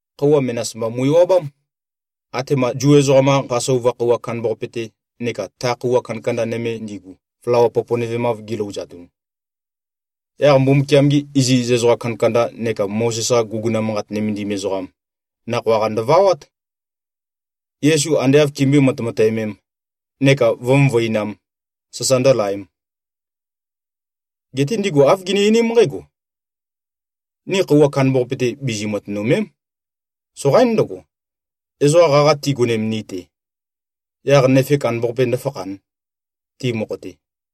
Khøuwa menas mba mu꞉-ewabám, atema Zu ezoqam-qa Pasova khøuwa kandambaqape-te neka ta khøuwa kandakanda nøme ndigu, flawa poponøvemav gilouzatun. Yaq Mbumbukiam-gi iziz ezoqa kandakanda neka Mozes-qa guguna manqat nømendim ezoqam nakhoa-qa ndøvawát, Yesu ande āv kimbøé-matemateømēm, neka vǿ-møvøinām, sasa ndǿlaēm. Geté ndigu āv gini-einím nqǽgo, “Ni khøuwa kandambaqape-te, bizi-matønø̀me᷄m. Soqaín ndøgo, ezoqa qaqa tigonem ni-te, yaq nøfe kandambaqape ndǿfakhān, ti mokho-te.”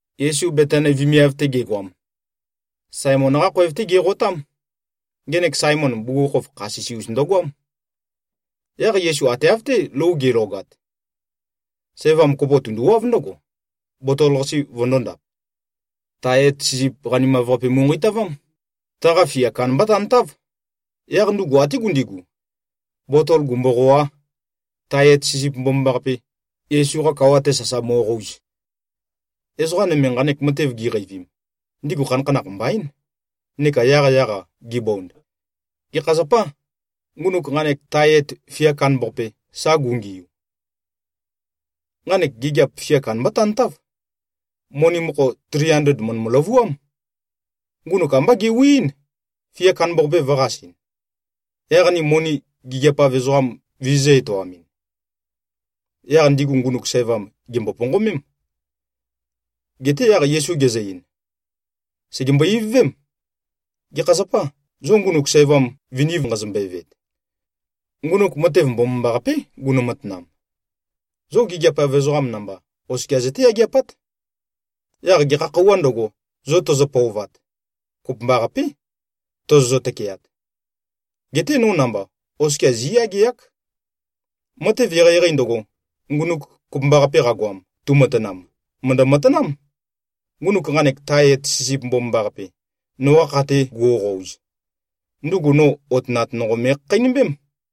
Yesu Betani vemiav-te gegoam, Saemon-qá khoev-té geqotám. Ngenek Saemon, bugukhokhof kha sisi-us ndøgoám. Yaq Yesu ate av-té lou ge꞉logat, sævam kopo tunduwáv ndǿgo, botol-qase vøndōndap. Tae et sisip qanimav-qape mu꞉nqeitavám. Taqa fia kandambá tantáv. Yaq ndugu até gundigu, botol gumboqòā, tae et sisip mbomambaqape, Yesu-qa kawa-te sasa mo꞉qouz. Ezoqa nøme, nqanek matev giqeivim, ndigu khanakhanakh mbaín, neka yaqyaq-a gibond, “Gekha zapâ, ngunuk nqanek tae et fia kandambaqape, sa gungiu? Nqanek gigiap fia kandambá tantáv. Moni mokho tri andled mø̀ndø-løvuám. Ngunuk ambá gewiín, fia kandambaqape vø̄qasɨn, yaq ni moni gigiap-av ezoqam vizizø̄-etoamɨn.” Yaq ndigu ngunuk sævam gèmbo-ponqomém. Geté yaq Yesu gezø-ein, “Sègembo-ivøvém. Gekha zapâ, zo ngunuk sævam viniv nqazombøe-veet? Ngunuk matev mbomambaqapé gunø-matanam. Zo gigiap-av ezoqam namba, oskia zøté-yageapát. Yaq gekha khøuwā ndøgo, zo tøzø-pøovat, kopømbaqapé tozozø-tøkeat. Geté no namba, oskia zí꞉yageák. Matev eqeieqei ndøgo, ndugu kopømbaqape qagoam, tumatanam, mø̀ndø-matanám. Ngunuk nqanek tae et sisip mbomambaqape, noqa kha-te guoqouz, ndugu no otønat nonqo me꞉khakheinømbém.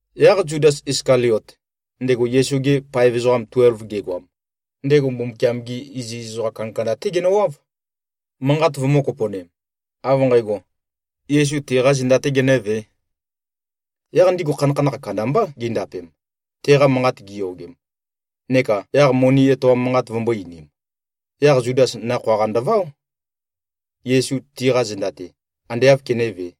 Yaq Zudas Iskaliot, ndego Yesu-gi paev ezoqa tuelv gegoam, ndego Mbumbukiam-gi iziz ezoqa kandakanda-té genøwáv, manqat vømø̄-kopo꞉nem, av nqægo, Yesu tiqā zenda-tē genø̄vē. Yaq ndigu khanakhanakh kandambá gindapem, teqa manqat giyogem, neka yaq-moni etoam manqat vømbō-einim. Yaq Zudas nakhoa-qa ndøváo, Yesu tiqa zenda-te, ande āv kenévē.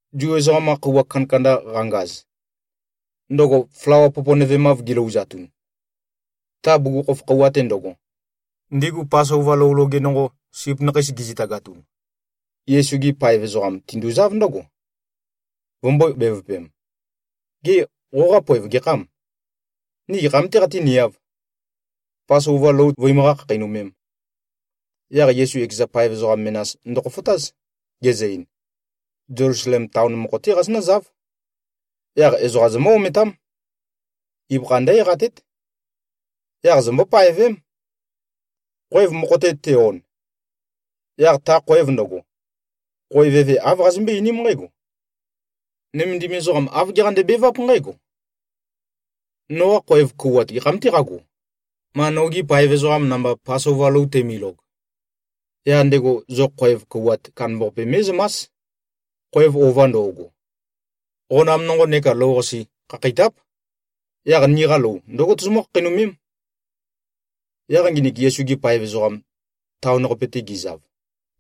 Zu ezoqam-qa khøuwa kandakanda qangaz, ndøgo flawa poponøvemav gilouzatun, ta bugukhokhof khøuwa-te ndøgo, ndigu Pasova lou loge nonqo, sip nakheis gizitagatun, Yesu-gi paev ezoqam tinduzáv ndǿgo, vømbō-bevøpem, “Gê, qoqa poev gekhâm? Ni gekham-tē qatíniāv, Pasova lou vøimøqá-khakheinømēm?” Yaq Yesu ekeza paev ezoqa menas ndøkhofotáz, gezø-ein, “Zelusalem taon mokho-té qazonǿzáv. Yaq ezoqam zomǿ-ometám. Ibøkha ndǿ-eqatét. Yaq zombó-paevém. Khoev mokho-te te-on, yaq ta khoev ndøgo, khoev eve āv qazømbøé-einím nqǽgo, ‘Nømendim ezoqam āv geqande-beváp nqǽgo: Noqa khoev kouwat gekham-tē qágo, ma nogi paev ezoqam namba Pasova lou teimilog?’ Yaq ndego zo khoev kouwat kandambaqape mé꞉zømás, khoev ova ndo꞉go. Qonam nonqo neka lou-qase khakheitáp. Yaq niqa lou ndǿgo tozomǿ-khakheinømém.” Yaq nginik Yesu-gi paev ezoqam, taon-qape-te gizav,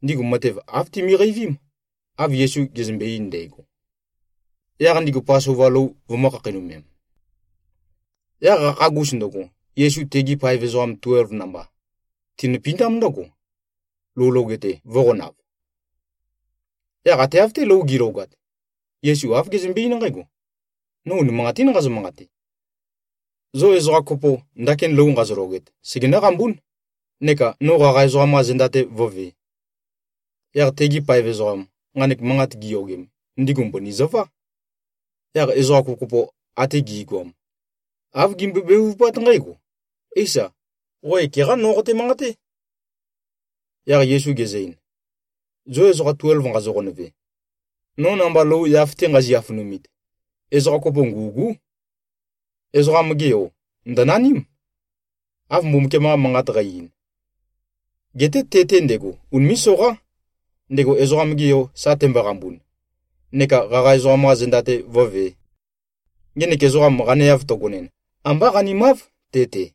ndigu matev āv timiqeivím, av Yesu gezømbe-ein ndægo. Yaq ndigu Pasova lou vømø̄-khakheinømem. Yaq qakhagus ndøgo, Yesu tegi paev ezoqam tuelv namba tinøpindám ndǿgo, lou loge-te vø̄qonav. Yaq ate av-té lou gi꞉logat, Yesu āv gezømbe-eín nqǽgo, “No unimanqatín nqazø-manqate. Zo ezoqa kopo, ndakin lou nqazologet, segenǿ-qambún, neka no qaqa ezoqam-qa zenda-te vǿvē.” Yaq tegi paev ezoqam, nqanek manqat giyogem, ndigu mbøni zøvá. Yaq ezoqa kopokopo ate gi꞉goam, āv gimbøe-bevupát nqǽgo, “Éisa. Qo ekeqá no qote-manqaté.” Yaq Yesu gezø-ein, “Zo ezoqa tuelv nqazo-qonøve, no namba lou yaf-te nqazi-afønumit, ezoqa kopo ngû꞉gú. Ezoqam-ge Yo ndø̀naním, av Mbumbukiam-qa Manqat qæ-ein. Geté te-te ndego, unimé꞉-soqá, ndego Ezoqam-ge Yo sa temboqambun, neka qaqa ezoqam-qa zenda-te vǿvē. Ngenek ezoqam qaneav tøgonin, ambá qanimáv te-te.”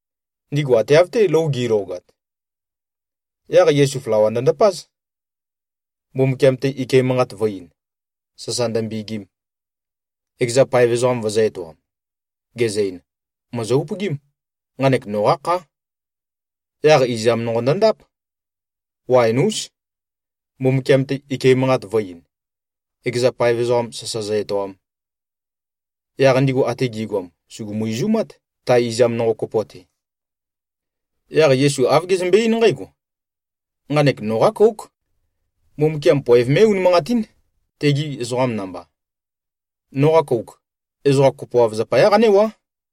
Ndigu ate av-té lou gi꞉logat, yaq Yesu flawa ndøndapáz, Mbumbukiam-te ike manqat vø̄-ein, sasa ndømbegim, ekeza paev ezoqam vøzø̄-etoam, gezø-ein, “Mòzo-upøgím. Nqanek noqá khá.” Yaq izam nonqo ndøndáp, waen-ús, Mbumbukiam-te ike manqat vø̄-ein, ekeza paev ezoqam sasa zø-etoam. Yaq ndigu ate gi꞉goam sùgumu-izumát, ta izam nonqo kopo-te. Yaq Yesu āv gezømbe-eín nqǽgo, “Nqanek noqá kóuk. Mbumbukiam poev mé꞉-unimanqatín, tegi ezoqam namba. Noqa kouk, ezoqam kopoav zapayá qanéwá.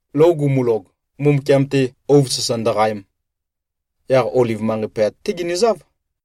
Lou gumulog, Mbumbukiam-te ouv sasa ndøqaem, yaq Oliv manqei pøyat-té ginøzáv.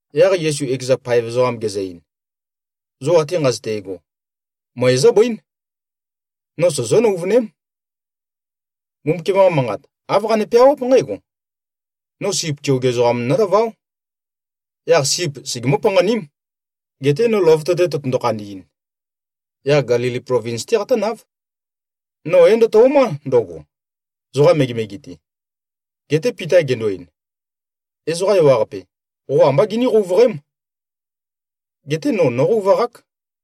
Yaq Yesu ekeza paev ezoqam gezø-ein, “Zo ate nqazøte꞉go, møe zóbøín. No sozó-nøuvøném. Mbumbukiam-qa Manqat, āv qane-peawáp nqǽgo, ‘No sip keoge ezoqam nólaváo. Yaq sip segemǿ-panqaním.’ Geté no løvøte-te tøtøndo-khandi꞉n, yaq Gelili plovins-té qatǿnáv. No é-ndøto꞉má ndøgo, zoqa megemege-te.” Geté Pita gendo-ein, “Ezoqa ewaqape, qo ambá giní-qouvøqém. Geté no, nóqouvaqák.”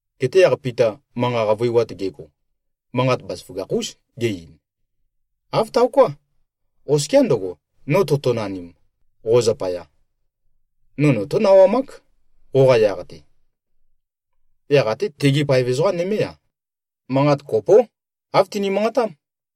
Geté yaq Pita manqa qavøiwat gego, manqat bazaføgakh-ús ge-ein, “Āv taoká. Oskiá ndøgo, no totonanim, qo zapaya, no notó-nawamák, qoqa yaq-te.” Yaq até tegi paev ezoqa nømé-a, manqat kopó, āv tini-manqatám.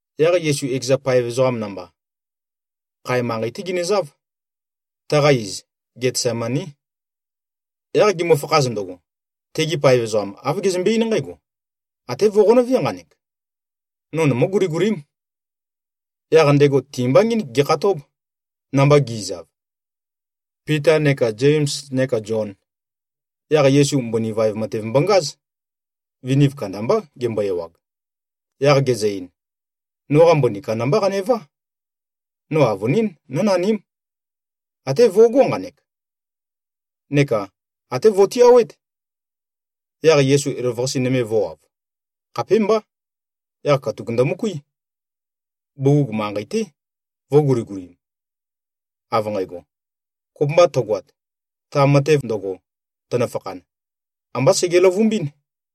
Yaq Yesu ekeza paev ezoqam namba, khae manqei-té ginøzáv. Taqa iz, Getsemaní. Yaq gimøfakhaz ndøgo, tegi paev ezoqam, āv gezømbe-eín nqǽgo, “Até vo꞉qonøvé nqanek. No nomǿ-guligulím.” Yaq ndego ti-mba ngínik gekhatób, namba gi꞉zav, Pita neka Zems neka Zion. Yaq Yesu mbøni vaev matev mbongáz. Viniv kandambá gembo-ewag. Yaq gezø-ein, “Noqa mbøni kandambá qanevá. No avønín, nǿnaním. Até vøgó nqanek, neka até vo꞉tiawét.” Yaq Yesu elavøqase nøme vø̄wav. Khapémbá. Yaq katuk ndømøkuí. Bugug manqei-té, vø̄guligulim, av nqægo, “Kopømba tøgoat, ta matev ndøgo, tønøfakhan, ambá sege-løvumbín.”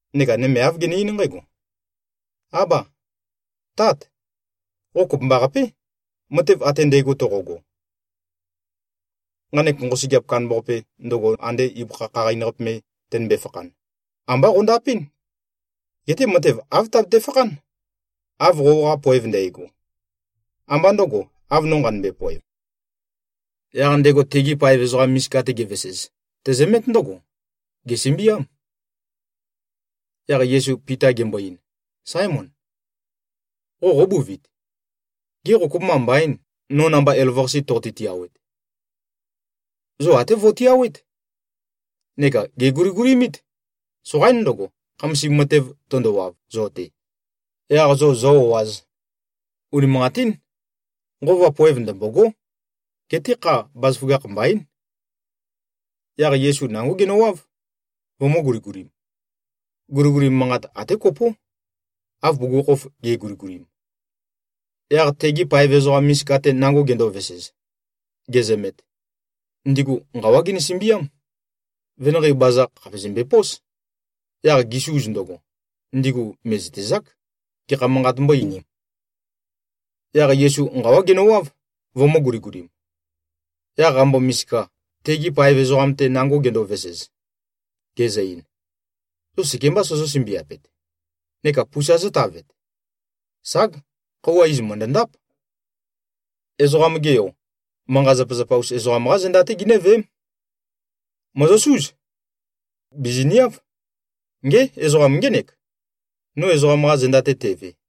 Neka nøme āv gene-eín nqǽgo, “Ába! Tát! Qo kopømbaqapé, matev ate ndægo toqogo. Nqanek nqosøgeap kandambaqape, ndøgo ande ibøkha khaqain-qape me tønømbe-fakhan, ambá qøndapɨ́n. Geté matev āv tabete-fakhán, av qoqa poev ndægo. Ambá ndø̄go, av no nqanømbe-poev.” Yaq ndego tegi paev ezoqa misika-te gevesez, tezømét ndǿgo. Gèsømbiám. Yaq Yesu Pita gembo-ein, “Sáemon! Qo qóbuvit? Ge qô, kopømba mbaîn, no namba elavøqase toqote-tiawet? Zo até vo꞉tiawét, neka gèguligulimít. Soqaín ndøgo, khamasim matev tøndowav zo-te, yaq zo zō-o꞉āz. Unimanqatín. Nqova poev ndømbôgó. Geté kha, bazaføgakh mbaín.” Yaq Yesu nangó genøwáv, vømø̄-guligulim. Guliguli manqat até kopó, av bugukhokhof ge꞉guligulim. Yaq tegi paev ezoqa misika-te nango gendovesez, gezømet, ndigu nqawá ginø-sømbiám. Venanqei baza khàpe zømbepós. Yaq gisuz ndøgo, ndigu mè꞉zøtezák, gekha manqat mbó-einīm. Yaq Yesu nqawá genøwáv, vømø̄-guligulim. Yaq qambo-misika, tegi paev ezoqam-te nango gendovesez, gezø-ein, “Zo sekembā sozó-sømbiapet neka pusa zótavet? Sag! Khøuwa iz mø̀ndøndáp. Ezoqam-ge Yo, manqa-zapazapa-us ezoqam-qá zenda-té ginǿveém. Mòzosúz. Bìziniáv. Ngé! Ezoqam ngének, no ezoqam-qa zenda-te teve!”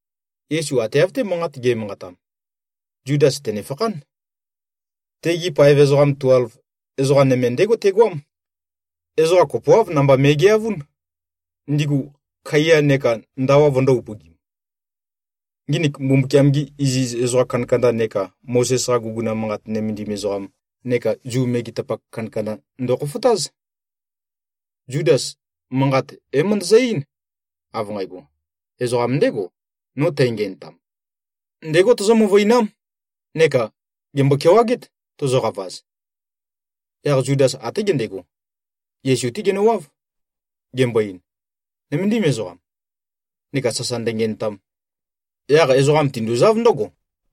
Yesu ate av-té manqat ge꞉manqatam, Zudas tènefakhán. Tegi paev ezoqa tuelv, ezoqa nøme ndégo tegoám. Ezoqa kopoáv namba me꞉geavún, ndigu kaiya neka ndawa vøndō-upøgim. Nginik Mbumbukiam-gi iziz ezoqa kandakanda neka Mozes-qa guguna manqat nømendim ezoqam neka Zu megetapak kandakanda ndokhofotáz. Zudas, manqat é-møndøzø-eín, av nqægo, “Ezoqam ndégo, no tængenøtam. Ndégo tozó-møvøinám, neka gèmbo-kewagét, tozoqavaz.” Yaq Zudas até gendego, Yesu-té genøwáv, gembo-ein, “Nøméndim ezoqam.” Neka sasa ndøngenøtam. Yaq ezoqam tinduzáv ndǿgo,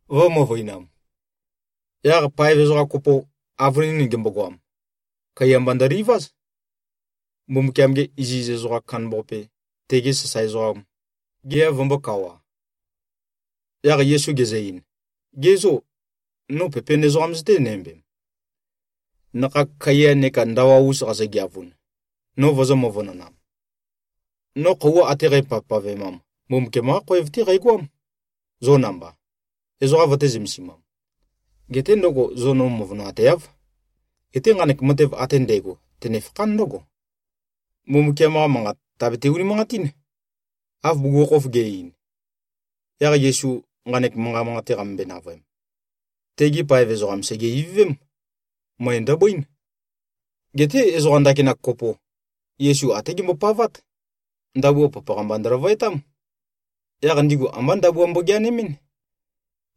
vø̄-møvøinam. Yaq paev ezoqa kopo, avønin gembogoam, kaiya mba ndøliváz, Mbumbukiam-ge iziz ezoqam kandambaqape, tege sasae ezoqam, gea vømbōkawa. Yaq Yesu gezø-ein, “Ge zô, no pepen ezoqam zøténæmbem, nakhag kaiya neka ndawa-us qazogeavun, no vozó-møvønonām? No khøuwa ate qæpavpavemam, Mbumbukiam-qá khoev-té qæqoám, zo namba, ezoqa vøtē-zømesimam. Geté ndøgo, zo no møvønoateáv. Geté nqanek matev ate ndægo, tønefakhán ndǿgo, Mbumbukiam-qa Manqat tàbete-unimanqatín, av bugukhokhof ge꞉-ein.” Yaq Yesu nqanek manqa manqate qamømbøe-navøem, tegi paev ezoqam sège-ivøvém. Møe ndøbøín. Geté ezoqa ndakinak kopo, Yesu até gembopavát. Ndabua papaqa-mba ndøløvøetám. Yaq ndigu ambá ndabua mbogeanemɨn.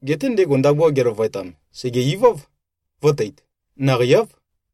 Geté ndego ndabua geløvøetam, sège-iváv, vø̄teit. Naqei-áv.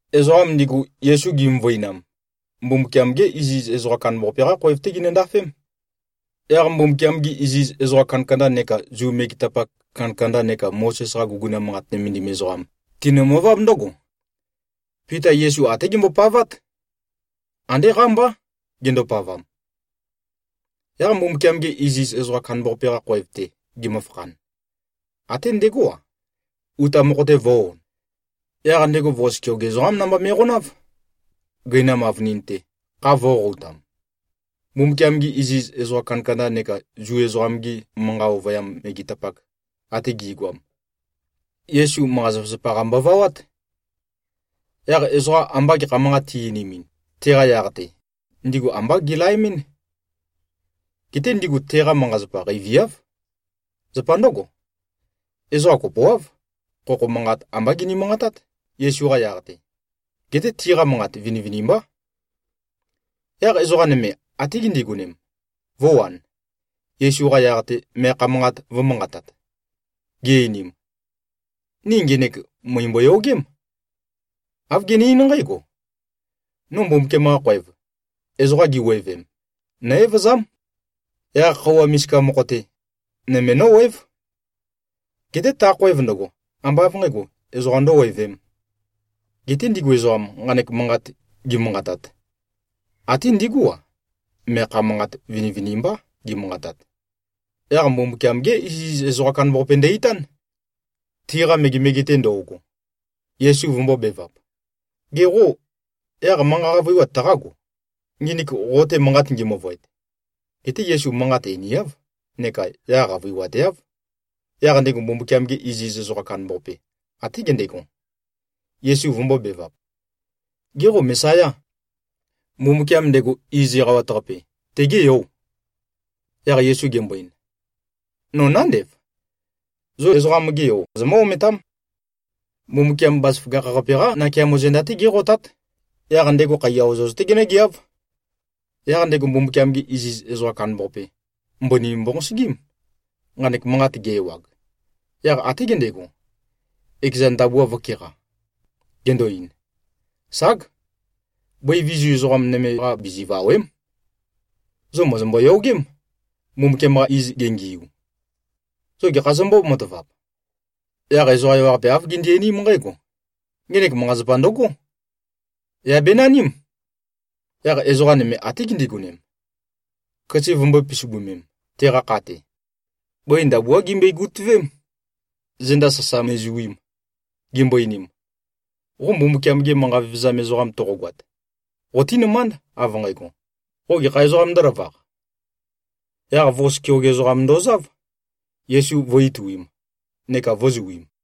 Ezoqam ndigu, Yesu gimøvøinam, Mbumbukiam-ge iziz ezoqam kandambaqape-qá khoev-té ginøndafém. Yaq Mbumbukiam-gi iziz ezoqa kandakanda neka Zu megetapak kandakanda neka Mozes-qa guguna manqat nømendim ezoqam, tinømøváb ndǿgo. Pita Yesu até gembopavát. Andé qámbá gendopavam. Yaq Mbumbukiam-ge iziz ezoqam kandambaqape-qa khoev-te gemøfakhan, até ndegó-a, uta mokho-te vø̄-on. Yaq ndego vos keoge ezoqám namba me꞉qonáv, gøinam avønin-te, kha vø̄qoqoutam. Mbumbukiam-gi iziz ezoqa kandakanda neka Zu ezoqam-gi manqa ovøyam megetapak ate gi꞉goam, Yesu, manqa-zapazapa-qa mbovawát. Yaq ezoqa amba gekha manqat ti-einimin, teqa yaq-te, ndigu ambá gelaemɨ́n. Geté ndigu teqa manqa-zapa qeiviáv. Zapa ndǿgo, ezoqa kopoáv, khokho manqat ambá gini-manqatát, Yesu-qa yaq-te. Geté tiqa manqat vinivinimbá. Yaq ezoqa nøme até gindigonem, vø̄wan, Yesu-qa yaq-te meakha manqat vø̄manqatat, gi-einim, “Ni ngenek mø̀imbo-yogém. Āv gene-eín nqǽgo, ‘No Mbumbukiam-qa khoev, ezoqa giwevem, nó-evøzám. Yaq khøuwa misika mokho-te, nøme nówév. Geté ta khoev ndøgo, ambá av nqǣgo, ezoqam ndøwevēm.’” Geté ndigu ezoqam, nqanek manqat gimanqatat, ate ndígu-a, meakha manqat vinivinimbá gimanqatat. Yaq Mbumbukiam-gé iziz ezoqam kandambaqape ndø-itán, tiqa megemege-te ndo꞉go, Yesu vømbōbevap, “Ge qô, yaq manqa qavøiwat taqágo, nginik qo-te manqat ngi-møvøet?” Geté Yesu manqat einiáv neka yaq qavøiwateáv. Yaq ndego Mbumbukiam-ge iziz ezoqam kandambaqape, até gendego, Yesu vømbōbevap, “Gê, qo Mesayâ? Mbumbukiam, ndego Iz Eqawat-Qape, tegê Yò?” Yaq Yesu gembo-ein, “No nándev! Zo Ezoqam-ge Yo zomǿ-ometám. Mbumbukiam Bazaføgakh-qape-qá nakeamo zenda-té géqotát. Yaq ndego khaiya ozoz-té genǿgeáv.” Yaq ndego Mbumbukiam-ge iziz ezoqam kandambaqape, mbøni mbonqosøgím, nqanek manqat ge-ewag. Yaq até gendego, ekeza ndabua vø̄keqa, gendo-ein, “Ság! Bøi vizu ezoqa nøme-qa bizivàwe᷄m. Zo mòzombo-yogém, Mbumbukiam-qa iz gengiu. Zo gekha zombó-matavap?” Yaq ezoqa ewaqape āv gindi-einím nqǽgo, “Ngenek manqa-zapa ndøgó. Yà benaním!” Yaq ezoqa nøme até gindigonem, køse vømbø̄e-pisibømem, teqa kha-te. Bøi ndabuá gimbøe-gutøvém, zenda sasa me꞉zuim, gimbo-einim, “Qo Mbumbukiam-ge manqa vevezam ezoqam toqogoat, qotínømánd, av nqægo, qo gekha ezoqām ndǿlavaq.” Yaq vos keoge ezoqam ndozáv, Yesu vø̄-ituim neka vø̄zuim.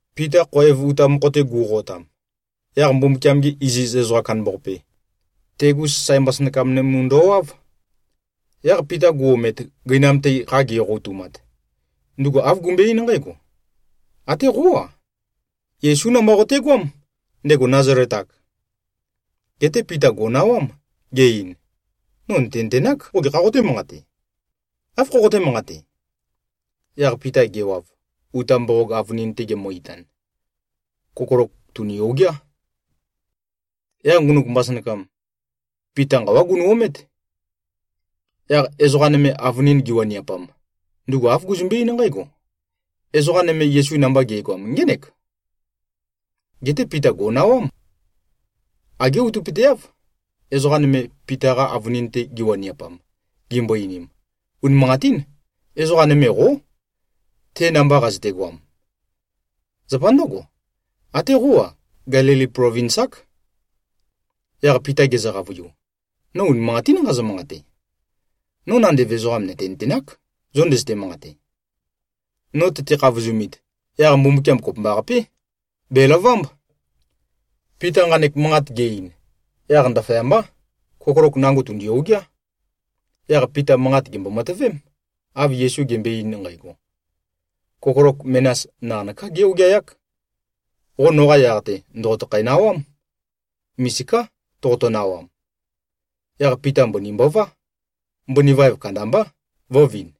Pita khoev uta mokho-te gu꞉qotam, yaq Mbumbukiam-ge iziz ezoqam kandambaqape, tegu sasae mbasønakam nømu ndowáv. Yaq Pita gu-omet, gøinam-te kha geqoqoutumat, ndugu āv gumbøe-eín nqǽgo, “Até qó-a, Yesú namba qotegoám, ndego Nazalet-ak!” Geté Pita gò꞉nawám, ge-ein, “No nø̀tenøtenák, qo gekhā qotē-manqate. Áv khoqoté-manqate?” Yaq Pita gewav, uta mboqog avønin-te gemø-itan, kokolok tùni-ogeá. Yaq ngunuk mbasønakam, Pita nqawá gunø-omét. Yaq ezoqa nøme, avønin giwaniapam, ndugu āv guzømbe-eín nqǽgo, “Ezoqa nøme, Yesu namba ge꞉goam, ngének.” Geté Pita gò꞉nawám. Agé outøpøteáv, ezoqa nøme, Pita-qa avønin-te giwaniapam, gimbo-einim, “Unimanqatín! Ezoqa nøme qó, te namba qazøtegoam. Zapa ndǿgo, até qó-a, Gelili plovins-ák.” Yaq Pita gezø-qavøiu, “No unimanqatín nqazø-manqate. No nandev ezoqam nø̀tenøtenák, zo ndøzøte-manqate. No tøte-khavozumit, yaq Mbumbukiam kopømbaqapé, bèlavámb.” Pita nqanek manqat ge-ein, yaq ndaføyambá, kokolok nango tùndi-ogeá. Yaq Pita manqat gèmbo-matøvém, av Yesu gembøe-ein nqægo, “Kokolok menas naqanøká gé-ogeayák. Qo noqa yaq-te, ndòqotøkhæ-nawám. Misiká toqoto-nawam.” Yaq Pita mbøni mbová. Mbøni vaev kandambá, vø̄vin.